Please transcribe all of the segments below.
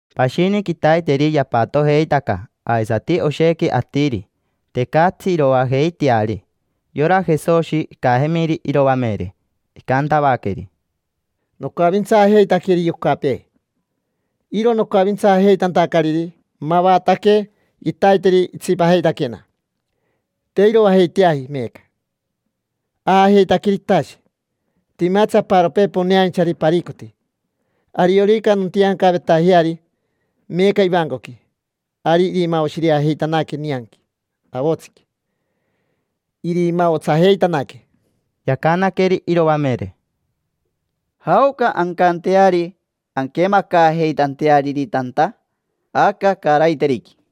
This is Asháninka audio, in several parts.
Pashini quitaiteri yapatojeitaca aisati oshequi atiri, tecatsi iroajeiteari. Yora Jesoshi icajemiri iroamere, icantavaqueri: —Nocavintsaajeitaqueri yocapee. Iro nocavintsaajeitantacariri mavataque quitaiteri itsipajeitaquena, te iroajeiteaji meeca. Aajeitaqueri itashe. Timatsi aparopee poneainchari paricoti: ariorica nontiancavetajeari meeca ivancoqui, ari irimaoshirejeitanaque nianqui avotsiqui, irimaotsajeitanaque. Yacanaqueri iroamere: —¿Jaoca ancanteari anquemacaajeitanteariri tanta? Aca caaraiteriqui.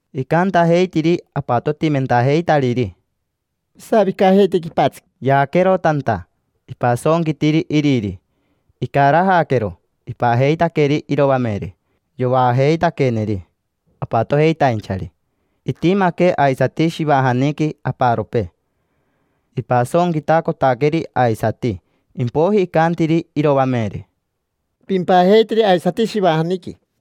Icantajeitiri apatotimentajeitariri: —Pisavicajeite quipatsiqui. Yaaquero tanta, ipasonquitiri iriri. Icarajaquero, ipajeitaqueri iroamere, yovaajeitaqueneri apatojeitainchari. Itimaque aisati shivajaniqui aparopee. Ipasonquitacotaqueri aisati. Impoiji icantiri iroamere: —Pimpajeiteri aisati shivajaniqui.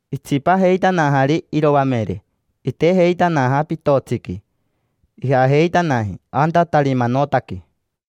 Itsipajeitanajari iroamere, itejeitanaja pitotsiqui. Ijajeitanaji anta Tarimanotaqui.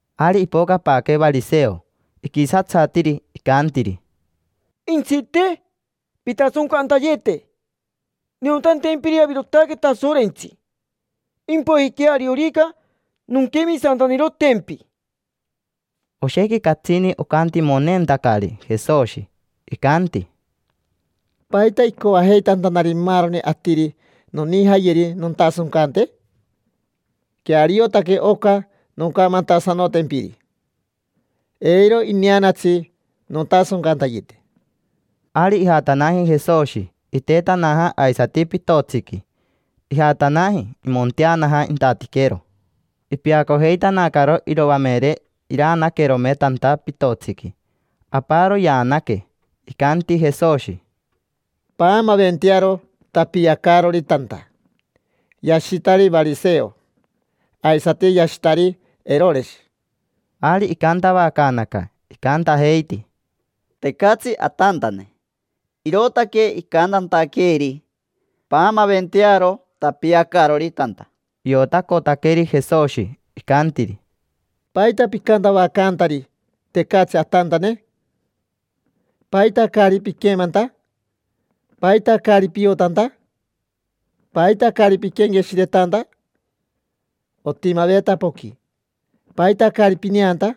Ari ipocapaaque variseo. Iquisatsatiri, icantiri: —Jentsite, pintasoncantayete niotantempiri avirotaque Tasorentsi, impoijiquea ariorica nonquemisantanirotempi. Oshequi catsini ocantimoneentacari Jesoshi. Icanti: —¿Paita icoajeitantari maaroni atiri nonijayeri nontasoncante? Queariotaque oca noncamantasanotempiri, eiro ineanatsi nontasoncantayete. Ari ijatanaji Jesoshi, itetanaja aisati pitotsiqui. Ijatanaji, imonteanaja intatiquero. Ipeacojeitanacaro iroamere iraanaquerome tanta pitotsiqui, aparo yaanaque. Icanti Jesoshi: —Paamaventearo tapiacaarori tanta, yashitari variseo, aisati yashitari Eroreshi. Ari icantavacaanaca, icantajeiti: —Tecatsi atantane, irootaque icantantaqueeri: “Paamaventearo tapiacaarori tanta”. Iotacotaqueri Jesoshi, icantiri: —¿Paita picantavacaantari: “Tecatsi atantane”? ¿Paita caari piquemanta? ¿Paita caari piotanta? ¿Paita caari piquenqueshiretanta? Otimaveta poqui, ¿paita caari pineanta?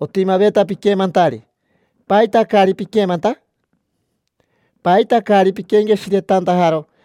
Otimaveta piquemantari, ¿paita caari piquemanta? ¿Paita caari pinquenqueshiretantajaro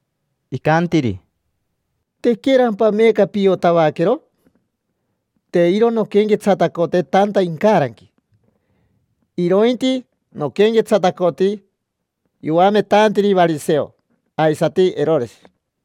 Icantiri: —¿Tequerampa meeca piotavaquero? Te iro nonquenquetsatacote tanta incaranqui, irointi noquenquetsatacoti yoametantiri variseo aisati Eroreshi.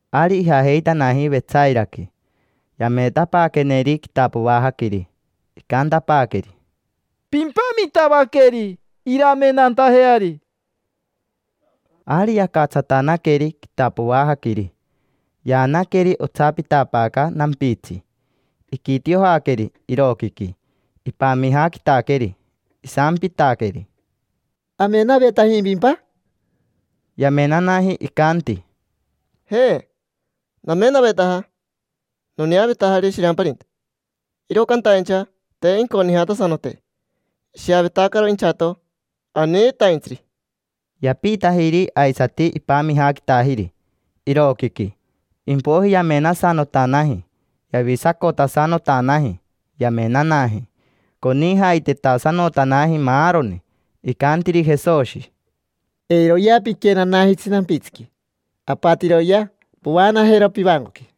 Ari ijajeitanaji Vetsairaqui. Yameetapaaqueneri quitapoajaquiri. Icantapaaqueri: —Pimpamitavaqueri iramenantajeari. Ari yacatsatanaqueri quitapoajaquiri, yaanaqueri otsapitapaaca nampitsi. Iquitiojaqueri iroquiqui, ipamijaquitaqueri. Isampitaqueri: —¿Amenavetajimpimpa? Yamenanaji, icanti: —Je, namenavetaja, noneavetajari shiramparinta, iro cantaincha te inconijatasanoteji, ishiavetacaro inchato, aniitaintsiri. Yapiitajiri aisati, ipamijaquitajiri iroquiqui. Impoiji yamenasanotanaji, yavisacotasanotanaji. Yamenanaji, conijaitetasanotanaji maaroni. Icantiri Jesoshi: —Eiroyea piquenanajitsi nampitsiqui, apatiroyea povaanajero pivancoqui.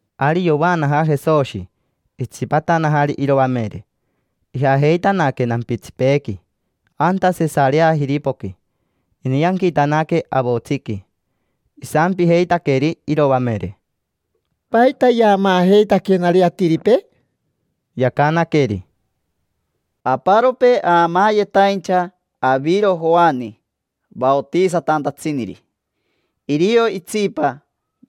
Ari yovaanaja Jesoshi, itsipatanajari iroamere. Ijajeitanaque nampitsipeequi anta Sesareajiripoqui. Inianquitanaque avotsiqui, isampijeitaqueri iroamere: —¿Paita yaamaajeitaquenari atiripee? Yacanaqueri: —Aparopee aamaayetaincha aviro Joani vaotisatantatsiniri. Irio itsipa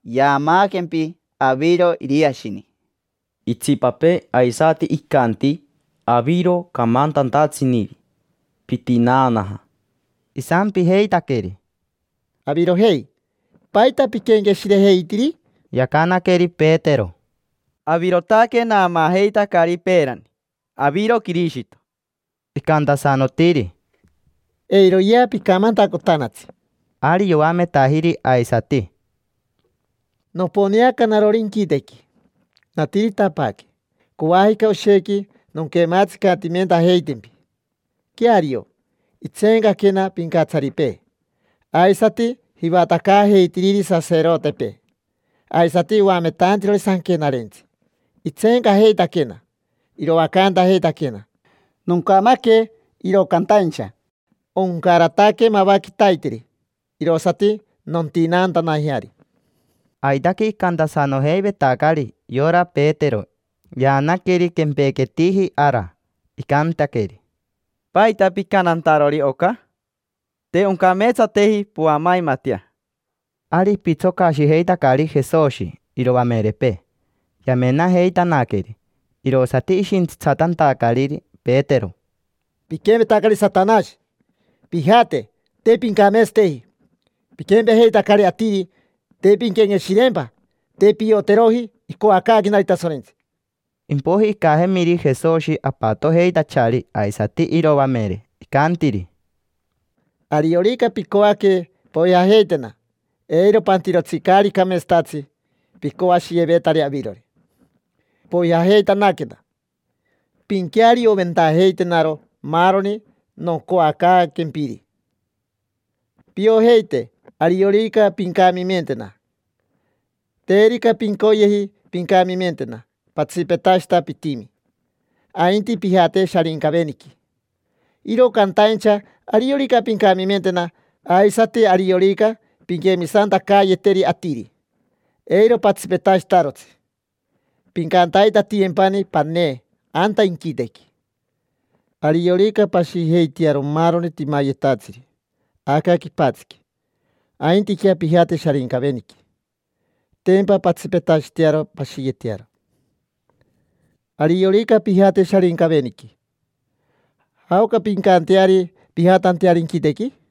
yaamaaquempi aviro Iriashini. Itsipapee aisati icanti aviro camantantatsiniri, pitinaanaja. Isampijeitaqueri: —Avirojei, ¿paita piquenqueshirejeitiri? Yacanaqueri Petero: —Avirotaque naamaajeitacari peerani: aviro Quirishito. Icantasanotiri: —Eiroyea picamantacotanatsi. Ari yoametajiri aisati: —Noponeaca narori inquitequi, natiritapaaque. Coajica oshequi nonquemaatsicatimentajeitempi. Queario, intseencaquena pincatsaripee, aisati jivatacaajeitiriri saserotepee, aisati oametantirori sanquenarentsi: intseencajeitaquena, iroacantajeitaquena. Noncamaque, iro cantaincha oncarataque mava quitaiteri, irosati nontinaantanajeari. Aitaque icantasanojeivetacari. Yora Petero yaanaqueri quempequetiji ara, icantaqueri: —¿Paita picantantarori oca? Te oncameetsateji poamaimatea. Ari ipitsocashijeitacari Jesoshi iroamerepee, yamenajeitanaqueri. Irosati ishintsitsatantacariri Petero: —Piquempetacari Satanashi. Pijate, te pincameetsateji. Piquempejeitacari atiri, te pinquenqueshireempa. Te pioteroji icoacaaquenari Tasorentsi. Impoiji icajemiri Jesoshi apatojeitachari aisati iroamere. Icantiri: —Ariorica picoaque poijajeitena, eiro pantirotsi caari cameetsatatsi picoashiyevetari avirori. Poijajeitanaquena, pinquearioventajeitenaro maaroni noncoacaaquempiri: piojeite ariorica pincamimentena. Terica pincoyeji pincamimentena, patsipetashita pitimi, ainti pijate Sharincaveniqui. Iro cantaincha ariorica pincamimentena, aisati ariorica pinquemisantacayeteri atiri, eiro patsipetashitarotsi: pincantaitatiyempani panee anta inquitequi. Ariorica pashijeitearo maaroni timayetatsiri aca quipatsiqui, aintiquea pijate Sharincaveniqui, tempa pantsipetashitearo pashiyetearo. Ariorica pijate Sharincaveniqui, ¿jaoca pincanteari pijatanteari inquitequi?